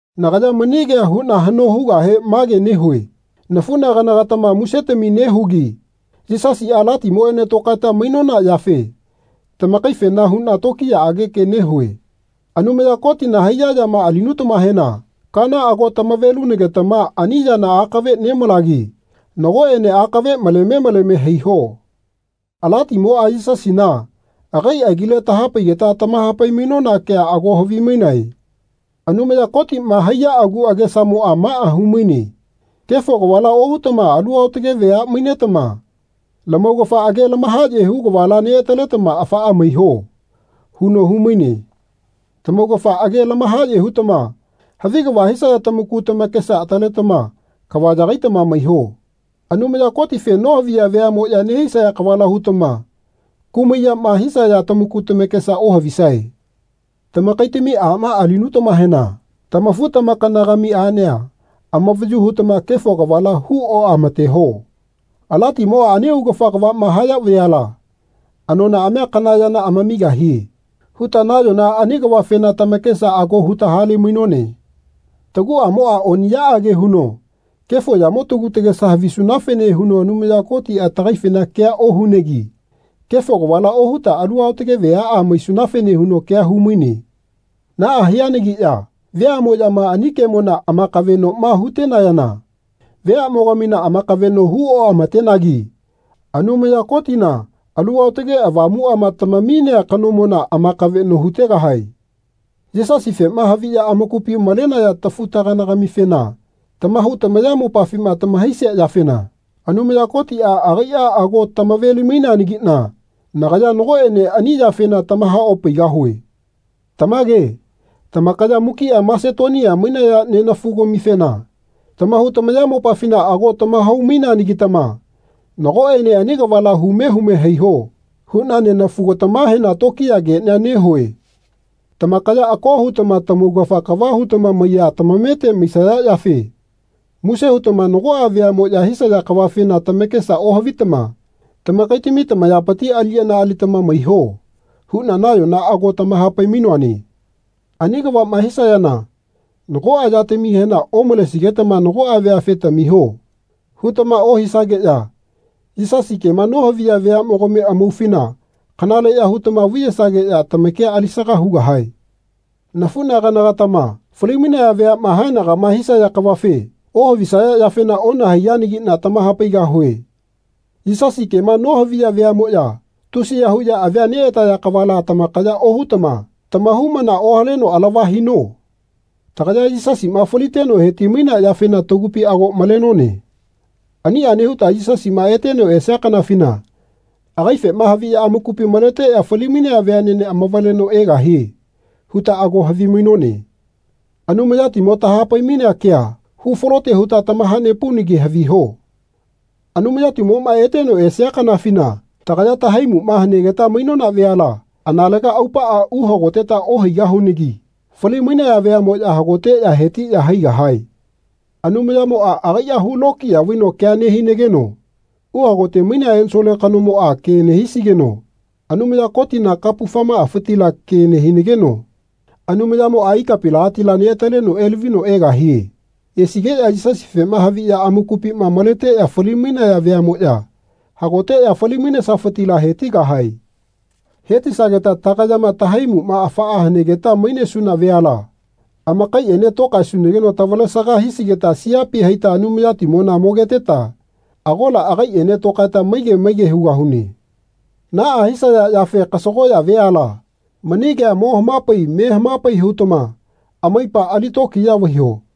Nagaya mani kea huna hano hugahe mage nehue nafunagana-gatama musetami nehugi Yisasia Alatimoene tokaeta mainona yafe tamakaifena huna tokiyaage ke nehue. Anumaya Kotina haiya yama alinutamahena kaana ago tamave-lunagetama ani yana akave nemalagi nagoene akave maleme maleme haiho. Alatimoa Yisasina agai agile tahapaigeta tamahapai-mainona kea ago havimainae. Anumaya Kotima haiya agu agesamoa maa humaine Kefo kavala ohutama alu aotage vea mainetama lamaugafa age lamahaye hu kavala neataletama afaa maiho. huno humaine. Tamaugafa age lamahaye hutama havi kava hisaya tamaku tamakesa ataletama kava yagaitama maiho. Anumaya Kotife nohaviya veamoya nehisaya kavala hutama kumai yama hisaya tamaku tamakesa ohavisae. Tamakaitami ama alinutamahena tamafu-tamakana-gami anea amavayu hutama kefo kavala hu oamateho. Alatimoa ani augafa kavama haya veala anonaamia kana yana amamigahie huta nayona ani kavafena tamakesa ago huta hale-mainone. Taguamoa oniyaage huno kefo yamo tagu tagesa havisunafene huno Anumaya Kotia tagaifena kea ohunegi kefo kavala ohuta alu aotage veaa maisunafene huno kea humaine. Naa hianagiya veamoyama ani kemona amakavenoma hutenayana veamogamina amakaveno hu oamatenagi Anumaya Kotina Alu Aotage Avamuama tamaminea kanomona amakaveno hutegahae. Yisasifema haviya amakupi malenaya tafu-tagana-gamifena tamahau tamayamopafima tamahaisia yafena Anumaya Kotia agaia ago tamave-limaineanagina nagaya nagoene ani yafena tamaha-opaigahue. Tamage tamakaya mukia Masetonia mainaya nenafu-gamifena tamahau tamayamopafina ago tamahau-maineanagitama Nagoene ani kavala hume hume haiho. huna nenafu-gatamahena tokiya kenia nehue. Tamakaya ako hutama tamaugafa kava hutama maiya tamamete maisaya yafe muse hutama nagoa veamoya hisaya kavafena tamakesa ohavitama tamakaitami tamayapiti aliyana alitama maiho huna nayona ago tamahapai-mainoane. Ani kavama hisayana nagoa yatamihena omalesigetama nagoa veafe Tamiho. hutama ohisageya Yisasi kema nohaviya veamogami amaufina kanaleya hutama vaiyesageya tamakia alisaga hugahae. Nafunagana-gatama fali-mainaya veama haenagama hisaya kavafe ohavisaya yafena onahaiyanagina tamahapaigahue. Yisasi kema nohaviya veamoya tusiya huya avia neataya kavala tamakaya ohutama tamahaumana ohaleno alava hino. Tagaya Yisasima faliteno heti-mainea yafena tagupi ago malenone. Ania nehuta Yisasima eteno esia kanafina agaifema haviya amakupi maleteya fali-mainaya veanene amavaleno egahie huta ago havimainone. Anumayatimo tahapai-mainea kea hufalote huta tamaha-nepaunagi haviho Anumayatimoma eteno esia kanafina tagaya tahaimuma hanegeta mainona veala analega aupaa uhagoteta ohaigahunagi fali-mainaya veamoya hagoteya hetiya haigahae. Anumayamoa agaia hu lokiya vaino kea nehinageno uhagote mainea ensole kanomoa ke nehisigeno Anumaya Kotina kapufamaafitila ke nehinageno Anumayamoa ikapinagatila neataleno elavino egahie. Esigeya Yisasifema haviya amakupima maleteya fali-mainaya veamoya hagoteya fali-mainesafitila hetigahae. Hetisageta tagayama tahaimuma afaa hanegeta mainesuna veala amakaiene tokaesunageno tavalesaga hisigeta siapi haita Anumayatimona mogeteta agola agaiene tokaeta maige maige hugahune. Naa hisaya yafe kasagoya veala mani kea mo hamapai me hamapai hutama amaipa ali tokiya vaiho.